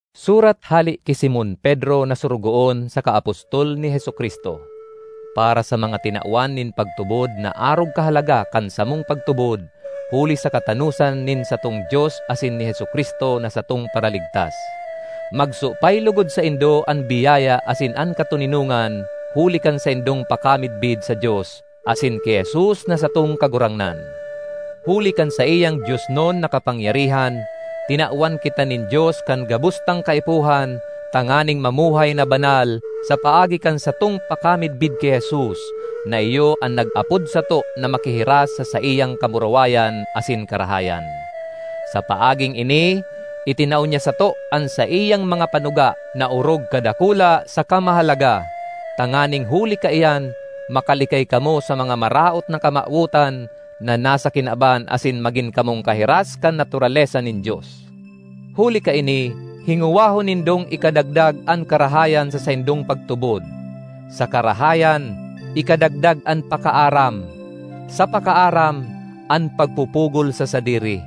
Surat hale ki Simon Pedro na sorogoon saka apostol ni Jesu-Cristo. Para sa mga tinawan nin pagtubod na arog kahalaga kan samong pagtubod huli sa katanosan nin satong Dios asin ni Jesu-Cristo na satong Paraligtas. Magsupay logod saindo an biyaya asin an katoninongan huli kan saindong pakamidbid sa Dios asin ki Jesus na satong Kagurangnan. Huli kan saiyang Diosnon na kapangyarihan, tinawan kita nin Dios kan gabos tang kaipuhan tanganing mamuhay na banal sa paagi kan satong pakamidbid ki Jesus, na iyo an nag-apod sato na makihiras sa saiyang kamurawayan asin karahayan. Sa paaging ini itinao niya sato an saiyang mga panuga na orog kadakula saka mahalaga, tanganing huli kaiyan makalikay kamo sa mga maraot na kamawotan na nasa kinaban asin magin kamong kahiras kan naturalesa nin Dios. Huli kaini hingowahon nindong ikadagdag an karahayan sa saindong pagtubod; sa karahayan, ikadagdag an pakaaram; sa pakaaram, an pagpupugol sa sadiri;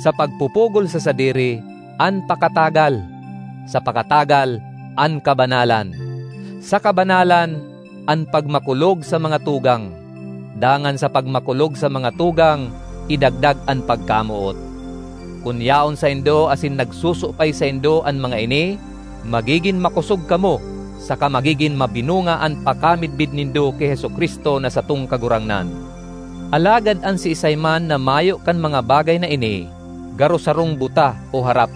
sa pagpupugol sa sadiri, an pakatagal; sa pakatagal, an kabanalan; sa kabanalan, an pagmakulog sa mga tugang; dangan sa pagmakulog sa mga tugang, idagdag an pagkamoot. Kun yaon saindo asin nagsusupay saindo an mga ini, magigin makosog kamo saka magigin mabinunga an pakamidbid nindo ki Jesu-Cristo na satong Kagurangnan. Alagad an siisay man na mayo kan mga bagay na ini, garo sarong buta o harap;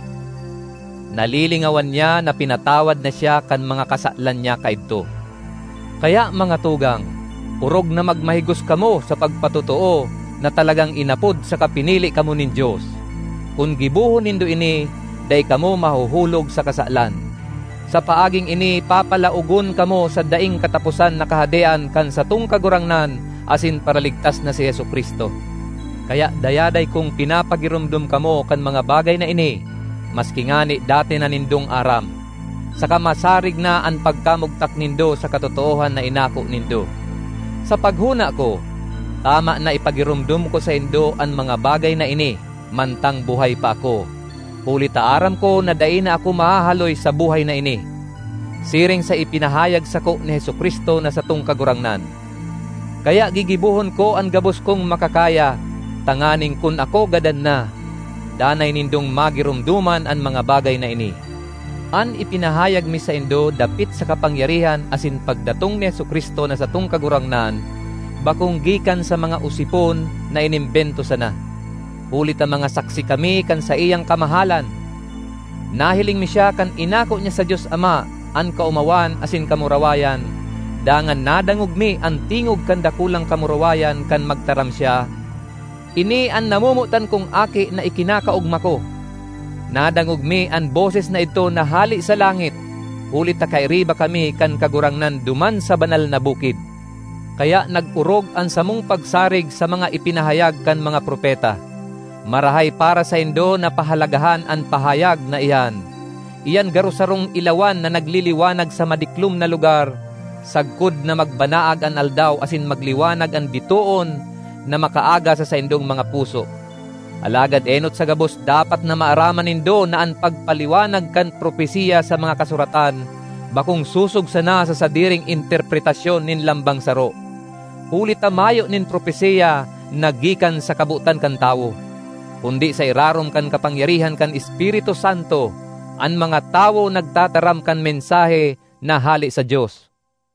nalilingawan niya na pinatawad na siya kan mga kasalan niya kaidto. Kaya, mga tugang, orog na magmahigos kamo sa pagpatotoo na talagang inapod saka pinili kamo nin Dios. Kun gibohon nindo ini dai kamo mahuhulog sa kasalan. Sa paaging ini papalaogon kamo sa daing kataposan na Kahadean kan satong Kagurangnan asin Paraligtas na si Jesu-Cristo. Kaya dayaday kong pinapagiromdom kamo kan mga bagay na ini maski ngani dati na nindong aram, saka masarig na an pagkamugtak nindo sa katotoohan na inako nindo. Sa paghona ko, tama na ipagiromdom ko saindo an mga bagay na ini, mantang buhay pa ako, huli ta aram ko na dai na ako mahahaloy sa buhay na ini, siring sa ipinahayag sako ni Jesu-Cristo na satong Kagurangnan. Kaya gigibohon ko an gabos kong makakaya tanganing kun ako gadan na, danay nindong magiromdoman an mga bagay na ini. An ipinahayag mi saindo dapit sa kapangyarihan asin pagdatong ni Jesu-Cristo na satong Kagurangnan bakong gikan sa mga osipon na inimbento sana, huli ta mga saksi kami kan saiyang kamahalan! Nahiling mi siya kan inako niya sa Dios Ama an kaomawan asin kamurawayan, dangan nadangog mi an tingog kan Dakulang Kamurawayan kan magtaram siya, “Ini an namomotan kong Aki na ikinakaogma ko!” Nadangog mi an boses na idto na hale sa langit, huli ta kairiba kami kan Kagurangnan duman sa banal na bukid. Kaya nag-orog an samong pagsarig sa mga ipinahayag kan mga propeta. Marahay para saindo na pahalagahan an pahayag na iyan—iyan garo sarong ilawan na nagliliwanag sa madiklom na lugar, sagkod na magbanaag an Aldaw asin magliwanag an bitoon na makaaga sa saindong mga puso. Alagad enot sa gabos dapat na maaraman nindo na an pagpaliwanag kan propesiya sa mga Kasuratan bakong sosog sana sa sadiring interpretasyon nin lambang saro. Huli ta mayo nin propesiya na gikan sa kabotan kan tawo; kundi sa irarom kan kapangyarihan kan Espiritu Santo, an mga tawo nagtataram kan mensahe na hale sa Dios.